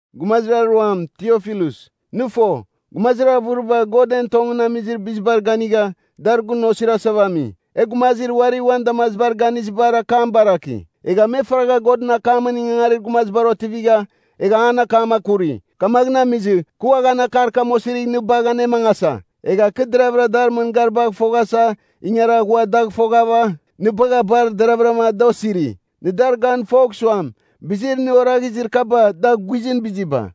Gumazir aruam, Tiofilus, nɨ fo, gumazir avɨriba God en tongɨn amizir bizibar ganigha, dar gun osirasava ami. E gumazir uari uan damaziba ganizibar akam baraki. Egha me faragha Godɨn akamɨn ingangarir gumazibar otivigha, egha an akam akuri. Kamaghɨn amizɨ, kɨ uaghan akar kam osirigh nɨ bagh anemangasa. Egha kɨ deraghavɨra dar mɨngaribagh foghasa ingara ghua dagh foghava, nɨ bagha bar deravɨrama da osiri. Nɨ dar gan fogh suam, bizir nɨ oraghizir kaba da guizɨn biziba.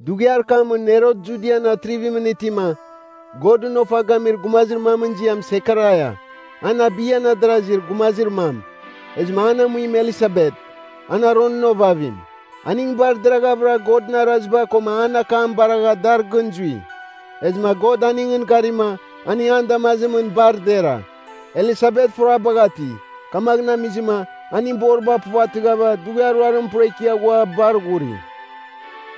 Dughiar kamɨn Herot Judian atrivimɨn itima, Godɨn ofa gamir gumazir mamɨn ziam Sekaraia, an Abiyan adarazir gumazir mam. Ezɨma an amuim Elisabet, an Aronɨn ovavim. Aning bar deraghavɨra Godɨn araziba koma an akam baragha dar gɨn zui. Ezɨma God aningɨn garima, aning an damazimɨn bar dera. Elisabet furabagh ati, kamaghɨn amizɨma aning boriba puvatɨghava, dughiar ruarim pura ikia ghua bar ghuri.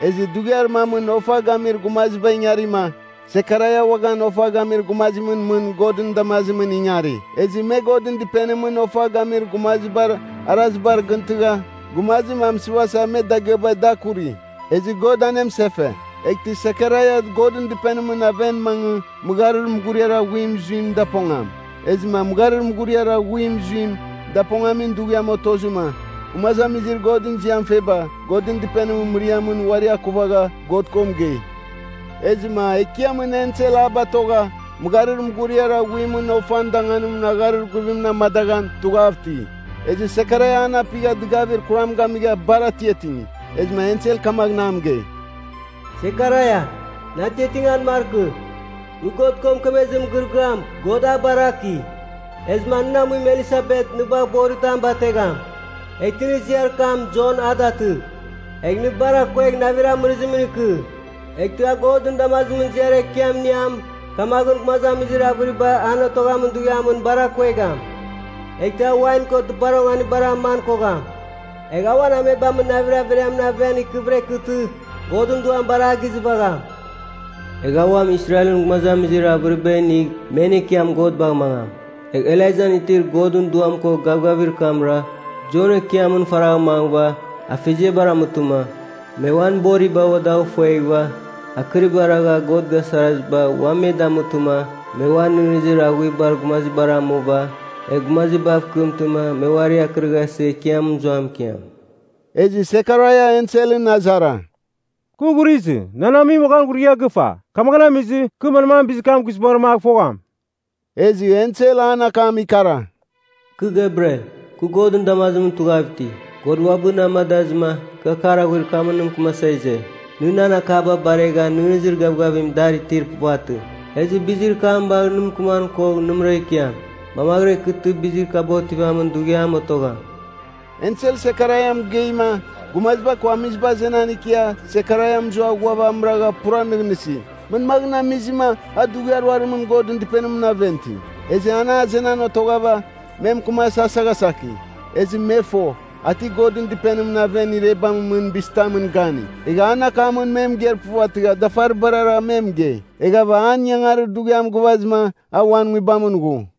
Ezɨ dughiar mamɨn ofa gamir gumaziba ingarima, Sekaraia uaghan ofa gamir gumazimɨn mɨn Godɨn damazimɨn ingari. Ezɨ me Godɨn Dɨpenimɨn ofa gamir gumazibar arazibar gɨntɨgha, gumazim amɨsɨvasa me dagɨabagh da kuri. Ezɨ God anemɨsefe. Eghtɨ Sekaraia Godɨn Dɨpenimɨn aven mangɨ mɨgharir mughuriar aghuim zuim dapongam. Ezɨma mɨgharir mughuriar aghuim zuim dapongamin dughiam otozɨma, gumazamizir Godɨn ziam feba, Godɨn Dɨpenimɨn mɨriamɨn uari akuvagha God ko mɨgei. Ezɨma Ekiamɨn Ensel a batogha, mɨgharir mughuriar aghuimɨn ofan danganimɨn agharir guvimɨn amadaghan tughav iti. Ezɨ Sekaraia an apigha dɨgavir kuram gamigha bar atiatingi. Ezɨma ensel kamaghɨn a mɨgei, “Sekaraia, nɨ atiatingan markɨ, nɨ God ko mɨkemezir mɨgɨrɨgɨam, God a baraki. Ezɨma nɨn amuim Elisabet nɨ bagh otarim bategham. Eghtɨ nɨ ziar kam, Jon a datɨgh. Egh nɨ bar akuegh navir amɨrɨzimɨn ikɨ. Eghtɨ a Godɨn damazimɨn ziar ekiam iniam, kamaghɨn gumazamizir avɨriba an otoghamin dughiamɨn bar akuegham. Eghtɨ a wain ko dɨpar onganibar aman kogham. Egh a uan amebamɨn navir averiamɨn aven ikɨvɨra ikɨtɨ, Godɨn Duam bar a gizɨvagham. Egh a uam Israelɨn gumazamizir avɨriba inigh men Ekiam God bagh mangam. Egh Elaijan itir Godɨn Duam ko gavgavir kamra Jon Ekiamɨn faragh mangɨva, afeziabar amutɨma me uan boriba ua dagh fueghɨva, akɨriba ragha God gasaraziba ua me damutɨma me ua nɨghnɨzir aghuibar gumazibar amuva, egh gumazibav kɨmtɨma me uari akɨrɨghasɨ Ekiam mɨzuam ikiam.” Ezɨ Sekaraia enselɨn azara, “Kɨ ghurizɨ, nan amuim uaghan ghurigha gɨfa. Kamaghɨn amizɨ, kɨ manmaghɨn bizir kam guizbangɨra a gɨfogham?” Ezɨ ensel an akam ikara, “Kɨ Gebriel. Kɨ Godɨn damazimɨn tughav iti. God uabɨ na amadazɨma, kɨ akar aghuir kamɨn nɨ mɨkɨmasa ize. Nɨ nan akaba baregha nɨghnɨzir gavgavim dar itir puvatɨ. Ezɨ bizir kam bagh nɨ mɨkɨman kogh nɨmɨra ikiam, mamaghɨra ikɨtɨma bizir kaba otivamin dughiam otogham.” Ensel Sekaraia mɨgeima, gumaziba ko amiziba azenan ikia Sekaraia mɨzua ghuav amɨragha pura nɨghnɨsi, manmaghɨn amizim a dughiar ruarimɨn Godɨn Dɨpenimɨn aven iti? Ezɨ an azenan otoghava, me mɨkɨman asaghasaki. Ezɨ me fo, a ti Godɨn Dɨpenimɨn aven irebamɨn mɨn bizitamɨn gani. Egha an akamɨn me mɨgeir puvatɨgha dafaribara me mɨgei. Eghava an ingangarir dughiam gɨvazɨma, a uan nguibamɨn ghu.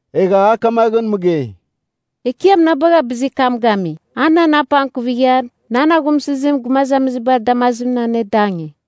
Egha a kamaghɨn mɨgei, “Ekiam na bagha bizir kam gami. A nan apangkuvigha nan aghumsɨzim gumazamizibar damazimɨn anedangi.”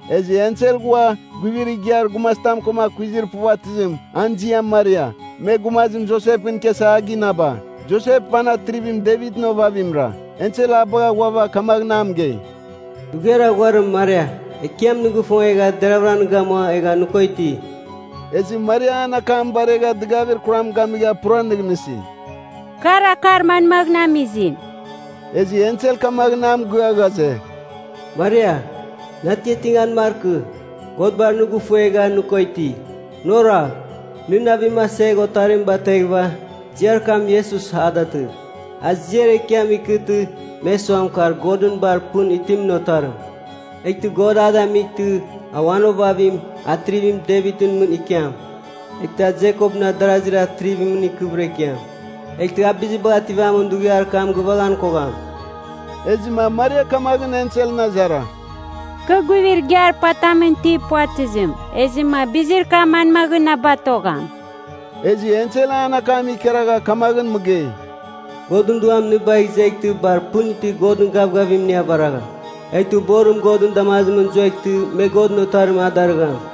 Ezɨ ensel ghua, guivir igiar gumazitam koma akuizir puvatɨzim, an ziam Maria, me gumazim Josepɨn ikiasa a ginaba. Josep, an Atrivim Devitɨn ovavimra. Ensel a bagha ghuava kamaghɨn a mɨgei, “Dughiar aghuarim Maria. Ekiam nɨ gifongegha deravɨra nɨ gamua egha nɨ ko iti.” Ezɨ Maria an akam baregha dɨgavir kuram gamigha pura nɨghnɨsi, “Kar akar manmaghɨn amizim?” Ezɨ ensel kamaghɨn a mɨgɨa ghaze, “Maria, nɨ atiatingan markɨ, God bar nɨ gifuegha nɨ ko iti. Nɨ oragh, nɨ navim asegh otarim bateghɨva, ziar kam Iesus, a datɨgh. A ziar ekiam ikɨtɨ, me suam, kar Godɨn bar pɨn itimɨn otarim. Eghtɨ God a damightɨ, a uan ovavim, Atrivim Devitɨn mɨn ikiam. Eghtɨ a Jekopɨn adarazir atrivimɨn ikɨvɨra ikiam. Eghtɨ a bizibagh ativamin dughiar kam gɨvaghan kogham.” Ezɨma Maria kamaghɨn enselɨn azara, “Kɨ guivir igiar patamɨn itir puvatɨzim. Ezɨma bizir kam manmaghɨn na batogham?” Ezɨ ensel an akam ikaragha kamaghɨn mɨgei, “Godɨn Duam nɨ bagh izeghtɨ bar pɨn itir Godɨn gavgavim nɨ avaragham. Eghtɨ borim Godɨn damazimɨn zueghtɨ me Godɨn Otarim a darɨgham.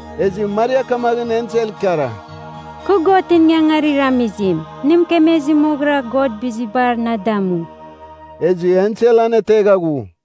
Ezɨ Maria kamaghɨn ensel ikara, “Kɨ Godɨn ingangarir amizim. Nɨ mɨkemezir moghɨra God bizibar na damu.” Ezɨ ensel anetegha ghu.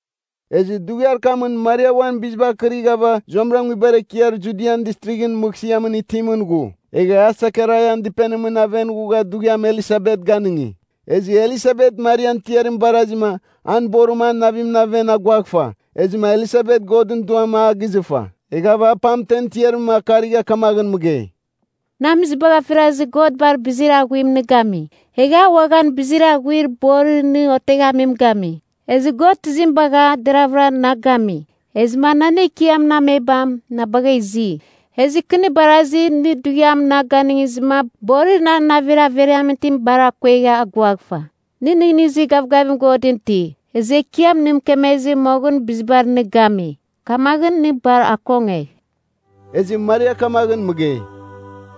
Ezɨ dughiar kamɨn Maria uan biziba akɨrighava zuamɨra nguibar ekiar Judian Distrighɨn mɨghsɨamɨn itimɨn ghu. Egha a Sekaraian dɨpenimɨn aven ghugha dughiam Elisabet ganɨngi. Ezɨ Elisabet Marian tiarim barazima, an borim an navimɨn aven aguaghfa, ezɨma Elisabet Godɨn Duam a gizɨfa. Eghava a pamtemɨn tiarim akarigha kamaghɨn mɨgei, “Nɨ amizibagh afirazɨ God bar bizir aghuim nɨ gami. Egh a uaghan bizir aghuim borir nɨ oteghamim gami. Ezɨ God tizim bagha deravɨra na gami, ezɨma nan Ekiamɨn amebam na bagh izi? Ezɨ kɨ nɨ barazi, nɨ dughiam na ganɨngizɨma borir na navir averiamɨn itim bar akuegha aguaghfa. Nɨ nɨghnɨzir gavgavim Godɨn iti, ezɨ Ekiam nɨ mɨkemezɨ moghɨn bizibar nɨ gami. Kamaghɨn nɨ bar akongegh.” Ezɨ Maria kamaghɨn mɨgei,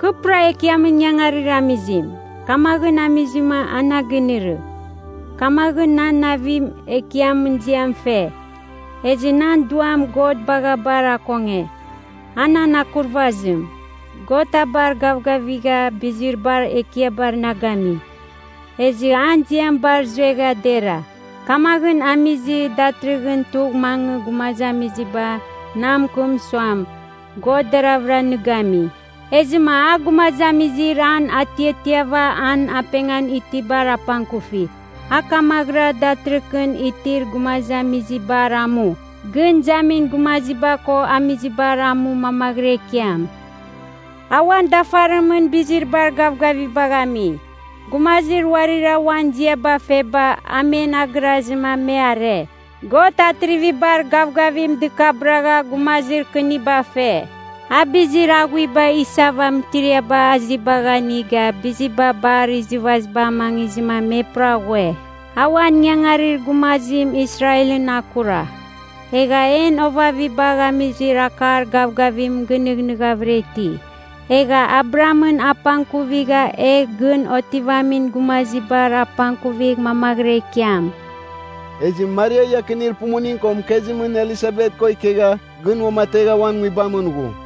“Kɨ pura Ekiamɨn ingangarir amizim, kamaghɨn amizɨma a na ginɨrɨ. Kamaghɨn nan navim Ekiamɨn ziam fe. Ezɨ nan duam God bagha bar akonge, a nan akurvazim. God a bar gavgavigha bizir bar ekiabar na gami. Ezɨ an ziam bar zuegha dera. Kamaghɨn amizɨ, datɨrɨghɨn tugh mangɨ gumazamiziba na mɨkɨm suam, God deravɨra nɨ gami. Ezɨma a gumazamizir an atiatiava an apengan itibar apangkufi. A kamaghɨra datɨrɨghɨn itir gumazamizibar amu gɨn izamin gumaziba ko amizibar amu mamaghɨra ikiam. A uan dafarimɨn bizir bar gavgavibagh ami. Gumazir uarira uan ziaba feba, a men agɨrazɨma me are. God atrivibar gavgavim dɨkabɨragha gumazir kɨniba fe. A bizir aghuiba isava mɨtiriaba azibagh aniga, biziba bar izɨvaziba amangizɨma me pura ghue. A uan ingangarir gumazim Israelɨn akura. Egha en ovavibagh amizir akar gavgavim gɨnɨghnɨghavɨra iti. Egha Abrahamɨn apangkuvigha, egh gɨn otivamin gumazibar apangkuvigh mamaghɨra ikiam.” Ezɨ Maria iakinir pumuning ko mɨkezimɨn Elisabet ko ikegha gɨn uamategh uan nguibamɨn ghu.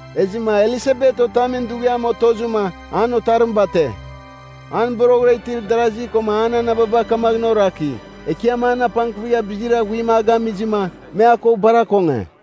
Ezɨma Elisabet otamin dughiam otozɨma, an otarim bate. An boroghɨra itir darasi koma an anababa kamaghɨn oraki, Ekiam an apangkuvigha bizir aghuim a gamizɨma, me a ko bar akonge.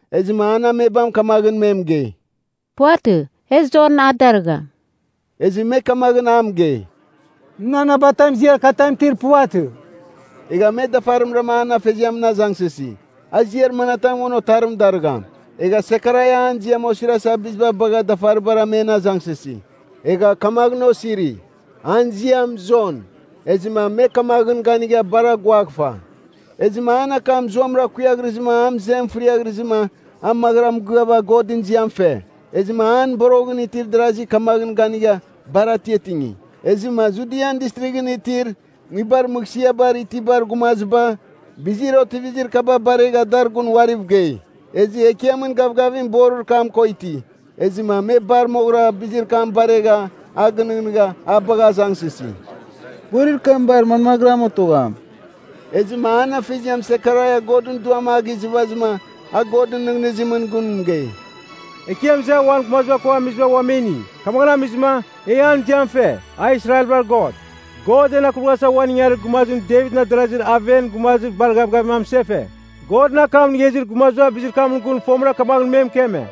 Ezɨma an amebam kamaghɨn me mɨgei, “Puvatɨ! E Jon a darɨgham.” Ezɨ me kamaghɨn a mɨgei, “Nɨn anabatam ziar katam itir puvatɨ.” Egha me dafarimra an afeziamɨn azangsɨsi, a ziar manatam uan otarim darɨgham. Egha Sekaraia an ziam osirasa biziba bagha dafaribara men azangsɨsi. Egha kamaghɨn osiri, “An ziam Jon.” Ezɨma me kamaghɨn ganigha bar aguaghfa. Ezɨma an akam zuamɨra kuiaghrɨzɨma an mɨzem fɨriaghrɨzɨma, a maghɨra mɨgɨava Godɨn ziam fe. Ezɨma an boroghɨn itir darazi kamaghɨn ganigha, bar atiatingi. Ezɨma Judian Distrighɨn itir nguibar mɨghsɨabar itibar gumaziba bizir otivizir kaba baregha dar gun uariv gei. Ezɨ Ekiamɨn gavgavim borir kam ko iti. Ezɨma me bar moghɨra bizir kam baregha, a gɨnɨghnɨgha a bagha azangsɨsi, “Borir kam bar manmaghɨram otogham?” Ezɨma an afeziam Sekaraia Godɨn Duam a gizɨvazɨma, a Godɨn nɨghnɨzimɨn gun mɨgei, “Ekiam iza uan gumaziba ko amiziba ua me ini, kamaghɨn amizɨma, e an ziam fe, a Israelbar God. God en akurvaghasa uan ingangarir gumazim Devitɨn adarazir aven gumazir bar gavgavim amɨsefe. Godɨn akam inigha izir gumaziba bizir kamɨn gun fomɨra kamaghɨn me mɨkeme.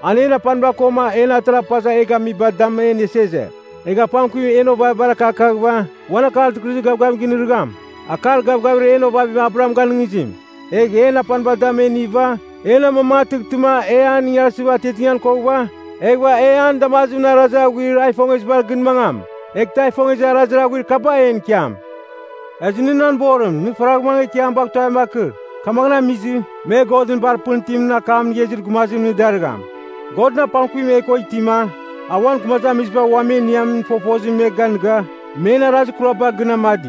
An en apaniba koma en atara pazav e gamibar dam e iniasa ize. Egh apangkuvim en ovavibar akakaghɨva, uan Akar Dɨkɨrɨzir Gavgavim nɨrɨgham, akar gavgavir en ovavim Abraham ganɨngizim. Egh en apaniba dam e iniva, en amamangatɨghtɨma e an ingarsɨva atiatingan koghɨva, eghɨva e an damazimɨn arazir aghuir a ifongezibar gɨn mangam, eghtɨ a ifongezir arazir aghuir kaba en ikiam. Ezɨ nɨ nan borim, nɨ faragh mangɨ Ekiam bagh tuavim akɨr. Kamaghɨn amizim, me Godɨn bar pɨn itimɨn akam inigha izir gumazim nɨ darɨgham. Godɨn apangkuvim e ko itima, a uan gumazamiziba ua me iniamin fofozim me ganɨga, men arazir kuraba gɨn amadi.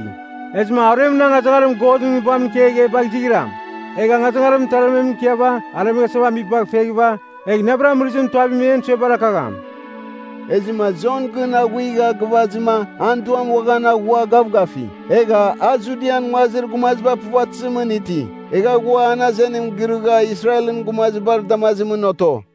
Ezɨma aruemɨn angazangarim Godɨn Nguibamɨn ikegh e bagh izighram. Egh angazangarim mɨtarmemɨn ikiava aremeghasava amibagh feghɨva, egh navir amɨrɨzimɨn tuavim en suebar akagham.” Ezɨma Jon gɨn aghuiga gɨvazɨma an duam uaghan aghua gavgafi. Egha a Judian nguazir gumaziba puvatɨzimɨn iti. Egha ghua an azenim girɨgha Israelɨn gumazibar damazimɨn oto.